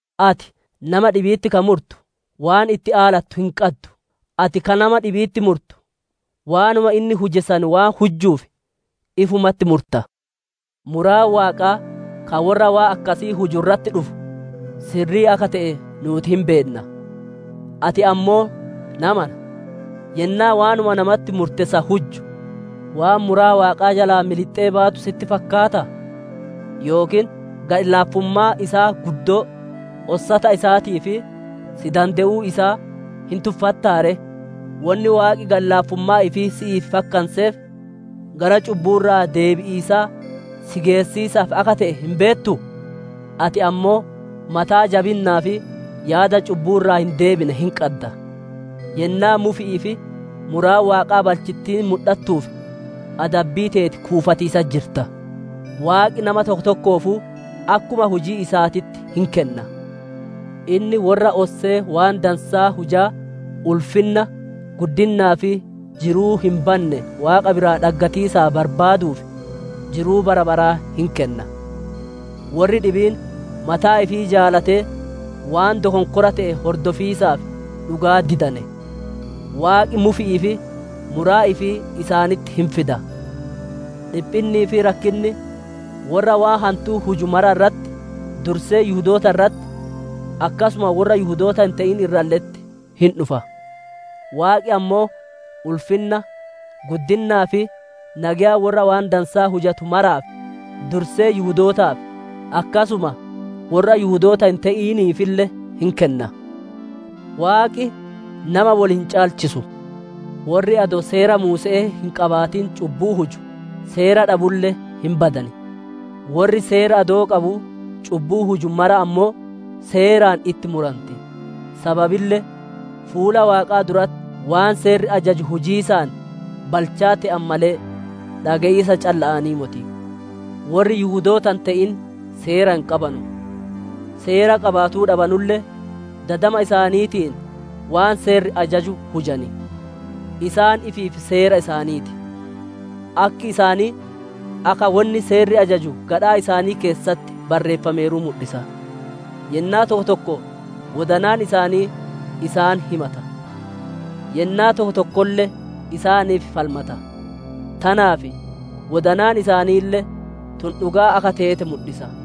Ati, nama dhibi'itti ka murtu, waan itti aalattu hin qaddu. Ati ka nama dhibi'itti murtu, waanuma inni huje san waan hujjuuf, ifumatti murta. Muraan Waaqaa ka worra waan akkasii huju irratti dhufu sirrii akka te'e nuuti hin beenna. Ati ammoo, namana, yennaa waanuma namatti murte san hujju, waan muraa Waaqaa jalaa milixxe baatu sitti fakkaataa? Yookiin gadhi-laafummaa isaa guddoo, ossata isaatii fi si dande'uu isaa hin tuffattaa ree? Wonni Waaqi gadhi-laafummaa ifii si'iif fakkanseef, gara cubbuu irraa deebi'iisaa si geessiisaaf akka te'e hin beettuu? Ati ammoo mataa jabinnaa fi yaada cubbuu irraa hin deebine hin qadda. Yennaa mufi'ii fi muraan Waaqaa balchittiin mudhattuuf adabbii teeti kuufatiisatti jirta. Waaqi nama tokko tokkoofuu akkuma hujii isaatitti hin kenna. Inni worra ossee waan dansaa hujaa ulfinna, guddinnaa fi jiruu hin banne Waaqa biraa dhaggatiisaaf barbaaduuf, jiruu bara baraa hin kenna. Worri dhibiin mataa ifii jaalatee waan dokonkora te'e hordofiisaaf dhugaa didane; Waaqi mufi'ii fi muraa ifii isaanitti hin fida. Dhiphinnii fi rakkinni worra waan hantuu huju mara irratti, dursee Yihudoota irratti akkasuma worra Yihudoota hin te'in irralle'etti hin dhufa. Waaqi ammoo ulfinna, guddinnaa fi nageya worra waan dansaa hujatu maraaf, dursee Yihudootaaf akkasuma worra Yihudoota hin te'iniifille hin kenna. Waaqi nama wol hin caalchisu. Worri adoo Seera Muuse'ee hin qabaatin cubbuu huju, Seera dhabulle hin badan; worri Seera adoo qabuu cubbuu huju maraa ammoo Seeraan itti muranti. Sababille fuula Waaqaa duratti waan Seerri ajaju hujiisaan balchaa te'an malee, dhage'iisa calla'aanii moti. Worri Yihudoota hin te'in Seera hin qabanu; Seera qabaatuu dhabanulle, dadama isaaniitiin waan Seerri ajaju hujan; isaan ifiif seera isaanii ti. Akki isaanii akka wonni Seerri ajaju gadhaa isaanii keessatti barreeffameeru mudhisa. Yennaa tokko tokko wodanaan isaanii isaan himata; yennaa tokko tokkolle isaaniif falmata; tanaaf, wodanaan isaaniille tun dhugaa akka teete mudhisa.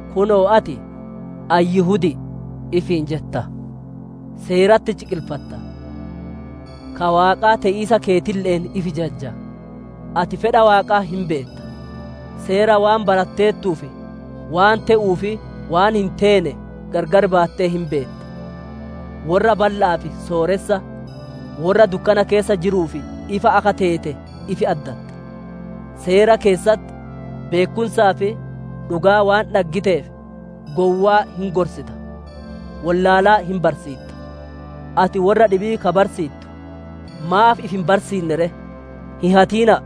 Kunoo ati, «Ani Yihudi'i» ifiin jetta; seeratti ciqilfatta; ka Waaqaa te'iisa keetille'een ifi jajja. Ati fedha Waaqaa hin beetta; Seera waan baratteertuuf waan te'uu fi waan hin teene gargar baattee hin beetta. Worra balla'aaf sooressa, worra dukkana keessa jiruuf ifa akka teete ifi addatta; Seera keessatti beekkumsaa fi dhugaa waan dhaggiteef, gowwaa hin gorsita, wollaalaa hin barsiitta. Ati worra dhibii ka barsiittu maaf ifi hin barsiinne ree? «Hin hatina'a!»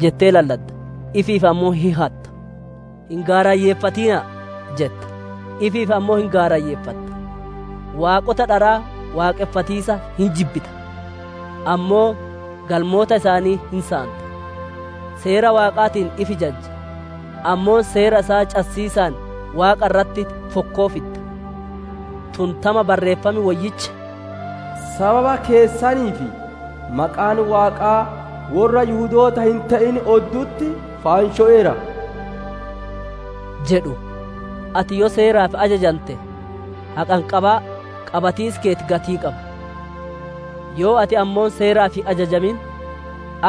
jettee lalladda, ifiif ammoo hin hatta; «Hin gaarayyeeffatina'a!» jetta, ifiif ammoo hin gaarayyeeffatta; waaqota dharaa waaqonfatiisa hin jibbita, ammoo galmoota isaanii hin saanta. Seera Waaqaatiin ifi jajja, ammoo seera isaa cassiisaan Waaqa irratti fokkoo fidda. Tun tama Barreeffam Woyyichi, «Sababa keessaniif, maqaan Waaqaa worra Yihudoota hin te'in oddu'utti faanshoweera» jedhu. Ati yoo Seeraaf ajajante, haqanqabaa qabatiisi keeti gatii qaba; yoo ati ammoo Seeraaf hin ajajamin,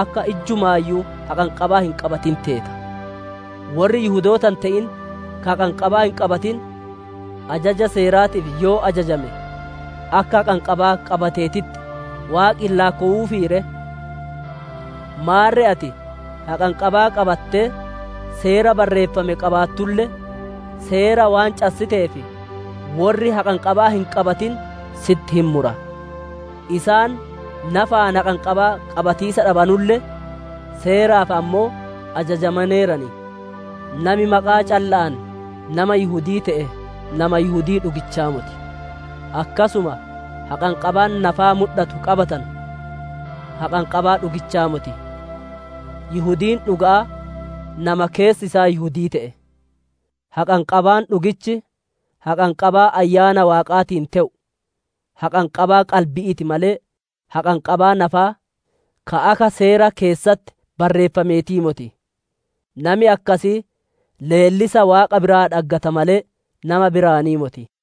akka ijjumaayyuu haqanqabaa hin qabatin teeta. Worri Yihudoota hin te'in ka haqanqabaa hin qabatin, ajaja Seeraatiif yoo ajajame, akka haqanqabaa qabateetitti Waaqi hin laakkowuufii ree? Maarre ati haqanqabaa qabattee Seera barreeffame qabaattulle, Seera waan cassiteef, worri haqanqabaa hin qabatin sitti hin mura; isaan nafaan haqanqabaa qabatiisa dhabanulle, Seeraaf ammoo ajajamaneeran. Nami maqaa calla'aan nama Yihudi'ii te'e nama Yihudii dhugichaa moti; akkasuma haqanqabaan nafaa mudhatu qabatanu haqanqabaa dhugichaa moti. Yihudiin dhuga'aa nama keessi isaa Yihudii te'e; haqanqabaan dhugichi, haqanqabaa Ayyaana Waaqaatiin te'u, haqanqabaa qalbi'ii ti malee, haqanqabaa nafaa, ka akka Seera keessatti barreeffameetii moti. Nami akkasii leellisa Waaqa biraa dhaggata malee, nama biraanii moti.